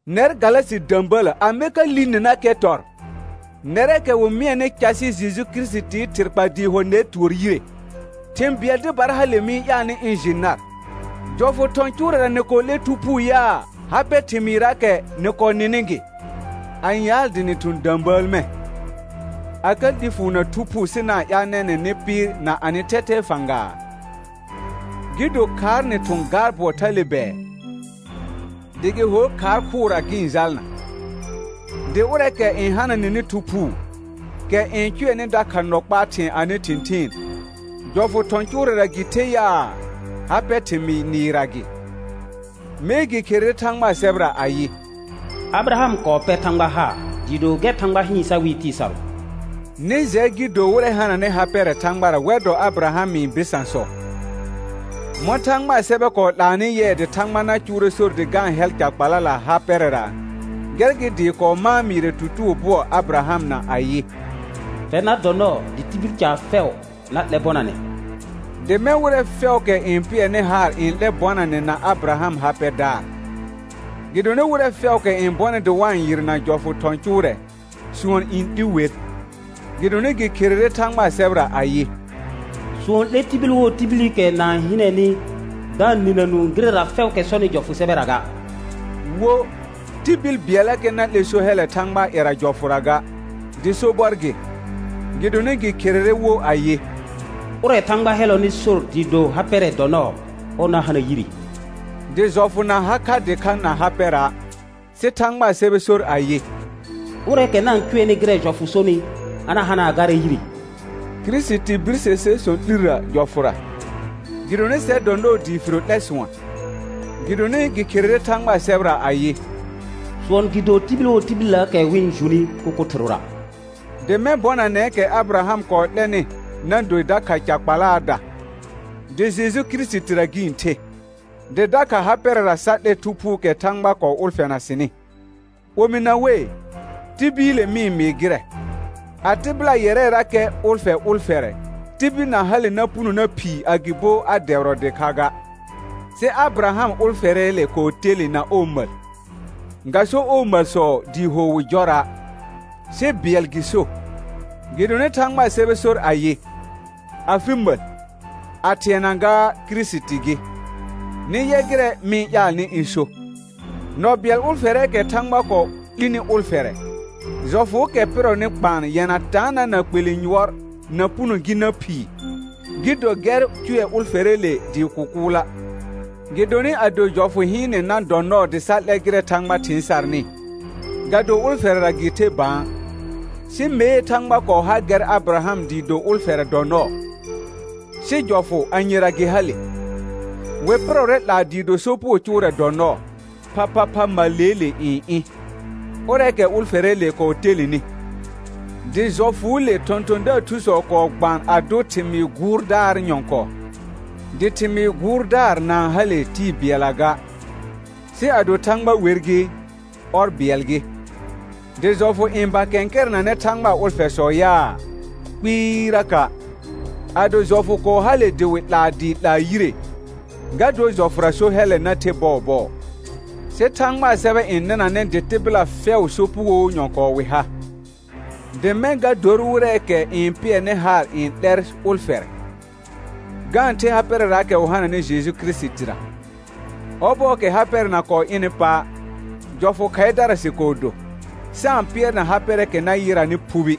Nɛr Galasɩ də̃bələ amɛ ka li ninakɛ tɔr? Nɛrɛɛkɛ wɩ mɩɛnɩ casɩ Jeju Kirisitii thɩr kpa dɩɩ ho nɛr tʋɔr yire. Thĩ bɩɛl dɩbara hale mɩ-n ƴaalnɩ ɩ̃ jɩ nar: Jɔfʋ thɔ̃ cʋʋrɛra nɩ kɔɔ 'lɛ Thu Phuu yaa, ha pɛ thɩmɩɩrraakɛ nɩ kɔɔ nɩnɩ gɩ? Ãyaal dɩ nɩ thʋ̃ də̃bəəl mɛ̃, a ka 'li fʋʋr na Thu Phuu sɩ na-n ƴaal nɛnɛ̃ nɩ pɩɩr na anɩ thɛthɛɛ fãgaa? Gɩ do khaar nɩ thʋ̃ gaar bʋɔ thale bɛɛ? Dɩ gɩ hor khaar khʋʋra gɩ-n jalna. Dɩ ʋrɛɛkɛ n hana nɩnɩ Thu Phuu, kɛ n cʋɛnɩ dakha nɔ kpaa thɩ̃ɛ anɩ thɩ̃thɩɩn, jɔfʋ thɔ̃ cʋʋrɛra gɩ the yaa, ha pɛ thɩmɩɩ nɩɩrra gɩ? Mee gɩ kherere Thãgbaa sɛbɛra ayɩ: «Abɩraham kɔɔ pɛr Thãgba haar dɩɩ do gɛr Thãgba hɩɩn sa wɩɩ tɩɩ sarʋ.» Nɩ jɛ gɩ do wɩrɛ hananɩ ha pɛrɛ Thãgbara wɛr dɔ Abɩrahamɩ bɩsãsɔ. Mɔ̃ Thãgbaa sɛbɛ kɔɔ 'laanɩ yɩɛ dɩ Thãgba na cʋʋrɛ sor dɩ ga-n hɛl ca kpalala ha pɛrɛra, gɛr gɩ dɩɩ kɔɔ mãa mɩɩrɛ tutugo bʋɔ Abɩrahamna ayɩ: «Fɛr na dɔ nɔɔ dɩ tibil caar fɛʋ na 'lɛ bɔnanɛ.» Dɩ mɛ̃ wɩrɛ fɛʋʋkɛ n pɩɛrnɩ haar n 'lɛ bɔnanɛ na Abɩraham ha pɛdaar. Gɩdonɩ wɩrɛ fɛʋʋkɛ n bɔnɩ dɩ wa-n yɩrna jɔfʋ thɔ̃ cʋʋrɛ, sʋɔn n 'li wer; gɩdonɩ gɩ kherere Thãgbaa sɛbɛra ayɩ: «Sʋɔn n 'le tibil wo tibilikɛ na-n hɩnɛnɩ da-n nɩna nũu gɩrɛra fɛʋʋkɛ sɔnɩ jɔfʋ sɛbɛra ga.» Wo, tibil bɩɛllakɛ na 'lɛ so hɛllɛ Thãgbaa ƴɛra jɔfʋra ga, dɩ sobɔr gɩ, gɩdonɩ gɩ kherere wo ayɩ: «Ʋrɛ Thãgba hɛllɔnɩ sor dɩɩ do ha pɛrɛ dɔ nɔɔ, ɔr na hana yire.» Dɩ jɔfʋ na ha kha dɩkha na ha pɛra', sɩ Thãgbaa sɛbɛ sor ayɩ: «Ʋrɛɛkɛ na-n cʋɛnɩ gɩrɛ jɔfʋ sonɩ, a na hana garɛ yire.» Kirisiti birse ser sɔ̃ 'lirrə jɔfʋra, gɩdonɩ sɛr dɔ nɔɔ dɩ firo 'lɛ sʋɔn, gɩdonɩ gɩ kherere Thãgbaa sɛbɛra ayɩ: «Sʋɔn gɩ do tibil wo tibilləəkɛ wɩ-n juni kʋkʋ thɩrʋra.» Dɩ mɛ̃ bɔnanɛɛkɛ Abɩraham kɔɔ 'lɛnɩ na do dakha ca kpalaada, dɩ Jeju Kirisitira gɩ-n the, dɩ dakha ha pɛrɛra sa 'lɛ Thu Phuukɛ Thãgba kɔɔ ʋlfɛna sɩnɩ. Omɩna wei, tibiile mɩ-n mɩɩ gɩrɛ, a tɩbɩla ƴɛrɛrakɛ ʋlfɛ ʋlfɛrɛ, tibil na hale na puno na phii agɩbo a dɛbɩrɔ dɩkha ga. Sɩ Abɩraham ʋlfɛrɛɛle kɔɔ telẽ na ɔɔ məl, ga so ɔɔ məlsɔ dɩɩ ho wɩ jɔra', sɩ bɩɛl gɩ so, gɩdonɩ Thãgbaa sɛbɛ sor ayɩ: «afɩ məl», a thɩɛna gaa Kirisiti gɩ. Nɩ yɛ gɩrɛ mɩ-n ƴaalnɩ ɩ̃ so: Nɔ bɩɛl ʋlfɛrɛɛkɛ Thãgba kɔɔ 'lini ʋlfɛrɛ, jɔfʋʋkɛ pɩrɔnɩ kpaan yɛna taanã na kpelẽ yʋɔr na puno gi na phii, gɩ do gɛr cʋɛ ʋlfɛrɛɛle dɩɩ kʋkʋʋla'. Gɩdonɩ ado jɔfʋ hɩɩnɛ na dɔ nɔɔ dɩ sa 'lɛ gɩrɛ Thãgba thɩɩn sarnɩ, ga do ʋlfɛrɛra gɩ the bã, sɩ mee Thãgba kɔɔ ha gɛr Abɩraham dɩɩ do ʋlfɛrɛ dɔ nɔɔ. Sɩ jɔfʋ anyera gɩ hale? Wɩ pɩrɔrɛ 'laa dɩɩ do sopugo cʋʋrɛ dɔ nɔɔ, phaphapha məlleele n ɩ̃, ʋrɛɛkɛ ʋlfɛrɛɛle kɔɔ telenɩ; dɩ jɔfʋʋle thɔ̃thɔ̃daar thusɔ kɔɔ gbaan a dʋ thɩmɩɩ gʋʋrdaar nyɔ̃kɔɔ. Dɩ thɩmɩɩ gʋʋrdaar na-n hale tɩɩ bɩɛlla ga, sɩ ado Thãgba wer gɩ, ɔr bɩɛl gɩ. Dɩ jɔfʋ n ba kɛ̃kɛrɛnanɛ Thãgbaa ʋlfɛsɔ yaa? Kpɩɩraka'. Ado jɔfʋ kɔɔ hale dɩ wɩ 'laa dɩɩ 'laa yire, ga dor jɔfʋra so hɛllɛ na the bɔɔbɔɔ. Sɩ Thãgbaa sɛbɛ n nɩnanɛ dɩ tɩbɩla fɛʋ sopugoo nyɔ̃kɔɔ wɩ ha, dɩ mɛ̃ ga dor wɩrɛɛkɛ n pɩɛrnɩ haar n 'lɛr ʋlfɛrɛ, ga-n the ha pɛrɛraakɛ wɩ hananɩ Jeju Kirisitira. Ɔbɔɔkɛ ha pɛrɛ na kɔɔ ɩnɩ pa', jɔfʋ khaɩdara sɩ kɔɔ do, sa-n pɩɛrna ha pɛrɛɛkɛ na yɩranɩ phubi.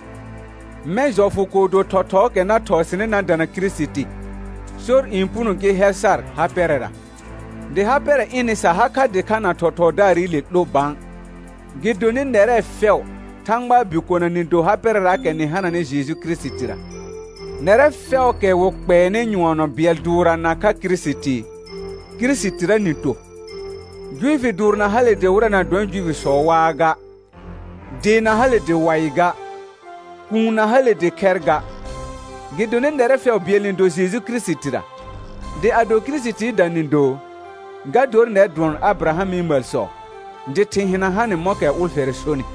Mɛ̃ jɔfʋ kɔɔ do thɔthɔɔkɛ na thɔɔ sɩnɩ na dana Kirisiti, sor n puno gɩ hɛl sar ha pɛrɛra. Dɩ ha pɛrɛ ɩnɩ sa ha kha dɩkha na thɔthɔɔdaarɩle 'lo bã. Gɩdonɩ nɛrɛ fɛʋ Thãgbaa bikona nɩ do ha pɛrɛraakɛ nɩ hananɩ Jeju Kirisitira; nɛrɛ fɛʋʋkɛ wɩ kpɛɛnɩ nyʋɔnɔ bɩɛl dʋʋrra nakha Kirisiti, Kirisitira nɩ to. Juifi dʋʋr na hale dɩ wɩrɛ na dɔnɩ Juifisɔ waa ga; dee na hale dɩ waɩ ga; kuun na hale dɩ khɛr ga; gɩdonɩ nɛrɛ fɛʋ bɩɛl nɩ do Jeju Kirisitira. Dɩ ado Kirisitiida nɩ do, ga dor nɛr dʋɔn Abɩrahamɩ məlsɔ, dɩ thɩ̃ hɩna hanɩ mɔ̃kɛ ʋlfɛrɛ sonɩ.